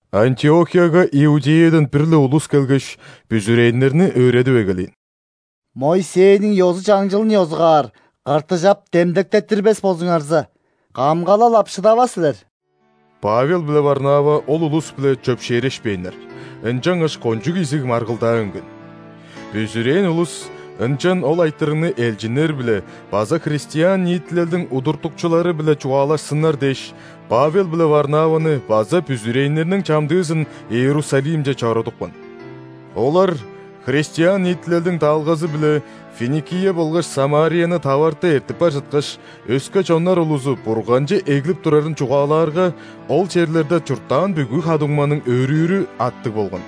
Антиохияга Иудеядан бир-ле улус келгеш, бүзүрээннерни өөредип эгелээн: «Моисейниң ёзу-чаңчылын ёзугаар ·кыртыжап демдектеттирбес болзуңарза, камгалал ап шыдавас силер». Павел биле Варнава ол улус-биле чөпшээрешпээннер, ынчангаш кончуг изиг маргылдаа үнген. Бүзүрээн улус ынчан ол айтырыгны элчиннер-биле база христиан ниитилелдиң удуртукчулары-биле чугаалашсыннар дээш, Павел биле Варнаваны база бүзүрээннерниң чамдыызын Иерусалимче чорудупкан. Олар христиан ниитилелдиң даалгазы-биле Финикия болгаш Самарияны таварты эртип бар чыткаш, өске чоннар улузу Бурганче эглип турарын чугаалаарга, ол черлерде чурттаан бүгү ха-дуңманың өөрүүрү аттыг болган.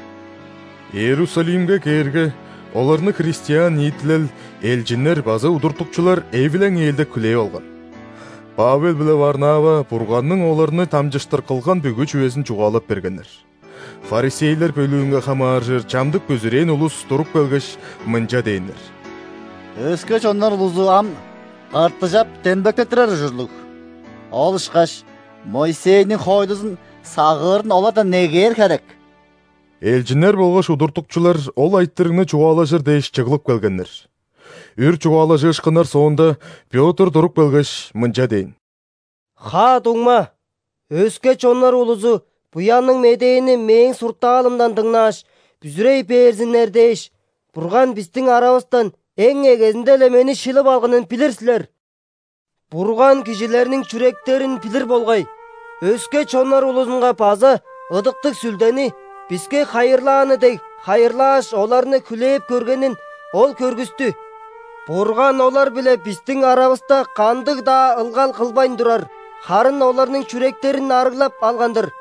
Иерусалимге кээрге, оларны христиан ниитилел, элчиннер база удуртукчулар эвилең-ээлдек хүлээп алган. Павел биле Варнава Бурганның оларны дамчыштыр кылган бүгү чүвезин чугаалап бергеннер. ·Фарисейлер бөлүүнге хамааржыр чамдык бүзүрээн улус туруп келгеш, мынча дээннер: «Өске чоннар улузу ам ·кыртыжап демдектеттирер ужурлуг, ол ышкаш Моисейниң хоойлузун сагыырын олардан негээр херек». Элчиннер болгаш удуртукчулар ол айтырыгны чугаалажыр дээш чыглып келгеннер. Үр чугаалажыышкыннар соонда, Пётр туруп келгеш, мынча дээн: «Ха-дуңма, өске чоннар улузу Буянныг Медээни мээң суртаалымдан дыңнааш, бүзүрей берзиннер дээш, Бурган бистиң аравыстан эң эгезинде-ле мени шилип алганын билир силер. Бурган кижилерниң чүректерин билир болгай, өске чоннар улузунга база Ыдыктыг Сүлдени, биске хайырлааны дег, хайырлааш, оларны хүлээп көргенин Ол көргүстү. Бурган олар-биле бистиң аравыста кандыг-даа ылгал кылбайн турар, харын оларның чүректерин арыглап алган-дыр,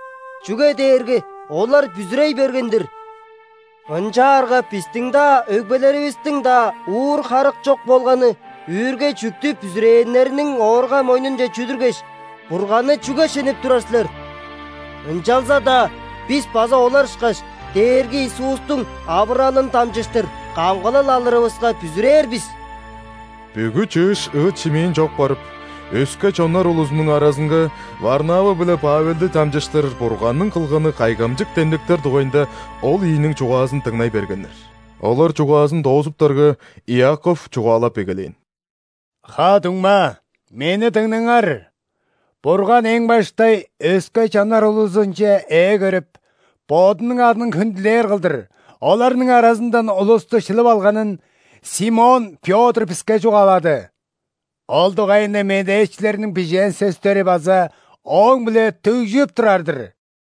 чүге дээрге олар бүзүрей берген-дир. Ынчаарга бистиң-даа, өгбелеривистиң-даа уур харык чок болганы үүрге-чүъктү бүзүрээннерниң оорга-мойнунче чүдүргеш, Бурганны чүге шенеп турар силер? Ынчалза-даа бис база олар ышкаш, Дээрги Иисустуң авыралын дамчыштыр камгалал алырывыска бүзүрээр бис». Бүгү чыыш ыыт-шимээн чок барып, өске чоннар улузунуң аразынга Варнава биле Павелди дамчыштыр Бурганның кылганы кайгамчык демдектер дугайында ол ийиниң чугаазын дыңнай бергеннер. Олар чугаазын доозуптарга, Иаков чугаалап эгелээн: «Ха-дуңма, мени дыңнаңар! Бурган эң баштай өске чоннар улузунче ээ көрүп, Бодунуң адын хүндүлээр кылдыр, оларның аразындан улусту шилип алганын Симон Пётр биске чугаалады. Ол дугайында медээчилерниң бижээн сөстери база ооң-биле дүгжүп турар-дыр: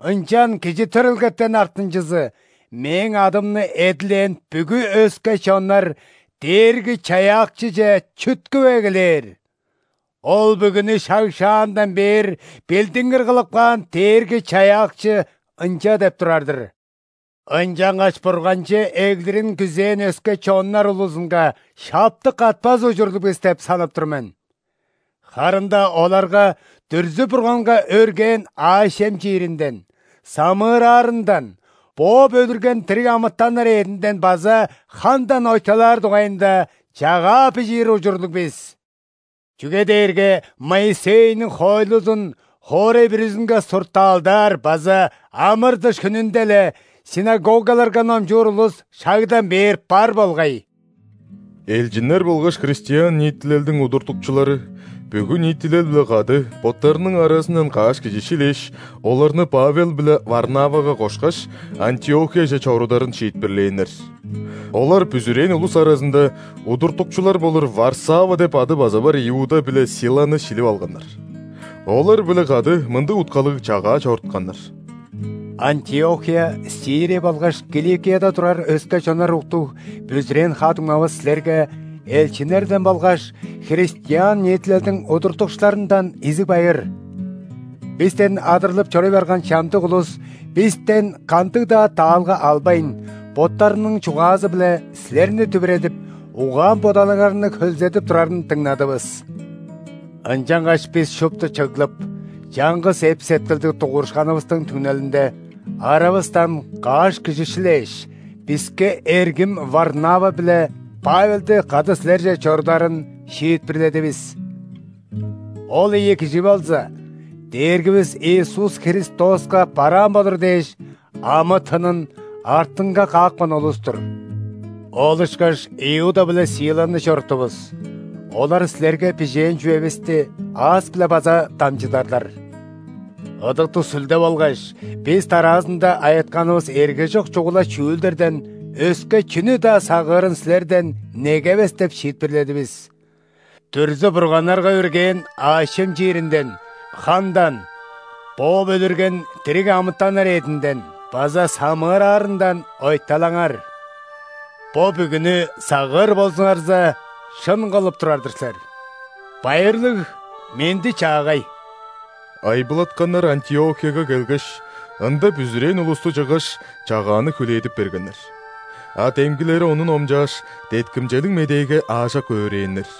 Ынчан кижи төрелгетен артынчызы – Мээң адымны эдилээн бүгү өске чоннарДээрги-Чаяакчыже чүткүп эгелээр.Ол бүгүнү шаг-шаандан бээр билдингир кылып каан Дээрги-Чаяакчыынча деп турар-дыр“. Ынчангаш Бурганче эглирин күзээн өске чоннар улузунга шаптык катпас ужурлуг бис деп санап тур мен. Харын-даа оларга дүрзү-бурганга өргээн аъш-чем чииринден, самыыраарындан, бооп өлүрген дириг амытаннар эъдинден база хандан ойталаар дугайында чагаа бижиир ужурлуг бис. Чүге дээрге Моисейниң хоойлузун хоорай бүрүзүнге суртаалдаар база ·амыр-дыш хүнүнде-ле ·синагогаларга номчуур улус шагдан бээр бар болгай». Элчиннер болгаш христиан ниитилелдиң удуртукчулары бүгү ниитилел-биле кады боттарының аразындан каш кижи шилээш, оларны Павел биле Варнавага кошкаш, Антиохияже чорударын шиитпирлээннер. Олар бүзүрээн улус аразында удуртукчулар болур Варсава деп ады база бар Иуда биле Силаны шилип алганнар. Олар-биле кады мындыг уткалыг чагаа чорутканнар: «Антиохия, Сирия болгаш Киликияда турар өске чоннар уктуг бүзүрээн ха-дуңмавыс силерге элчиннерден болгаш христиан ниитилелдиң удуртукчуларындан изиг байыр! Бистен адырлып чоруй барган чамдык улус бистен кандыг-даа даалга албайн, боттарының чугаазы-биле силерни дүвүредип, угаан-бодалыңарны хөлзедип турарын дыңнадывыс. Ынчангаш бис шупту чыглып, чаңгыс эп-сеткилдиг дугурушканывыстың түңнелинде, аравыстан каш кижи шилээш, биске эргим Варнава биле Павелди кады силерже чорударын шиитпирледивис. Ол ийи кижи болза Дээргивис Иисус Христоска бараан болур дээш амы-тынын артынга каапкан улус-тур. Ол ышкаш Иуда биле Силаны чоруттувус, олар силерге бижээн чүвевисти аас-биле база дамчыдарлар. Ыдыктыг Сүлде болгаш бис дараазында айытканывыс эргежок чугула чүүлдерден өске чүнү-даа сагыырын силерден негевес деп шиитпирледивис: дүрзү-бурганнарга өргээн аъш-чем чииринден, хандан, бооп өлүрген дириг амытаннар эъдинден база самыыраарындан ойталаңарR. Бо бүгүнү сагыыр болзуңарза, шын кылып турар-дыр силер. Байырлыг, менди-чаагай!» Айбылатканнар Антиохияга келгеш, ында бүзүрээн улусту чыггаш, чагааны хүлээдип бергеннер. А демгилери ону номчааш, деткимчелиг медээге аажок өөрээннер.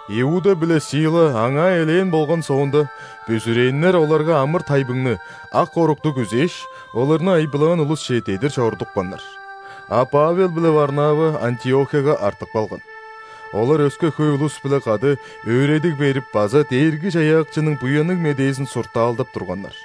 Иуда биле Сила аңаа элээн болган соонда, бүзүрээннер оларга амыр-тайбыңны, ак орукту күзээш, оларны айбылаан улусче дедир чорудупканнар. А Павел биле Варнава Антиохияга артып калган. Олар өске хөй улус-биле кады өөредиг берип база Дээрги-Чаяакчының Буянныг Медээзин суртаалдап турганнар.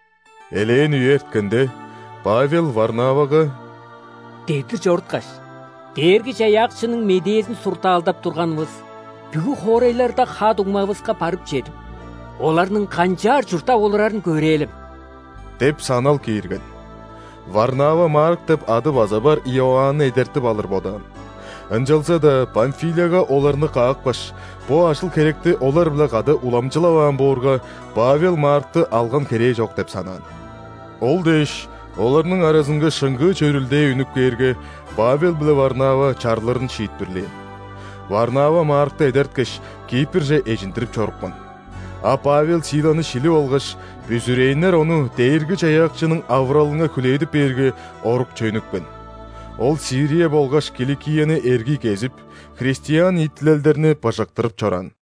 Элээн үе эрткенде, Павел Варнавага: «Дедир чоруткаш, Дээрги-Чаяакчының медээзин суртаалдап турганывыс бүгү хоорайларда ха-дуңмавыска барып чедип, оларның канчаар чурттап олурарын көрээлем» – деп санал киирген. Варнава Марк деп ады база бар Иоанны эдертип алыр бодаан. Ынчалза-даа Памфилияга оларны каапкаш, бо ажыл-херекти олар-биле кады уламчылаваан боорга, Павел Маркты алган херээ чок деп санаан. Ол дээш, оларның аразынга шыңгыы чөрүлдээ үнүп кээрге, Павел биле Варнава чарлырын шиитпирлээн. Варнава Маркты эдерткеш, Кипрже эжиндирип чорупкан. А Павел Силаны шилип алгаш, бүзүрээннер ону Дээрги-Чаяакчының авыралынга хүлээдип бээрге, орукче үнүпкен. Ол Сирия болгаш Киликияны эргий кезип, христиан ниитилелдерни быжыктырып чораан.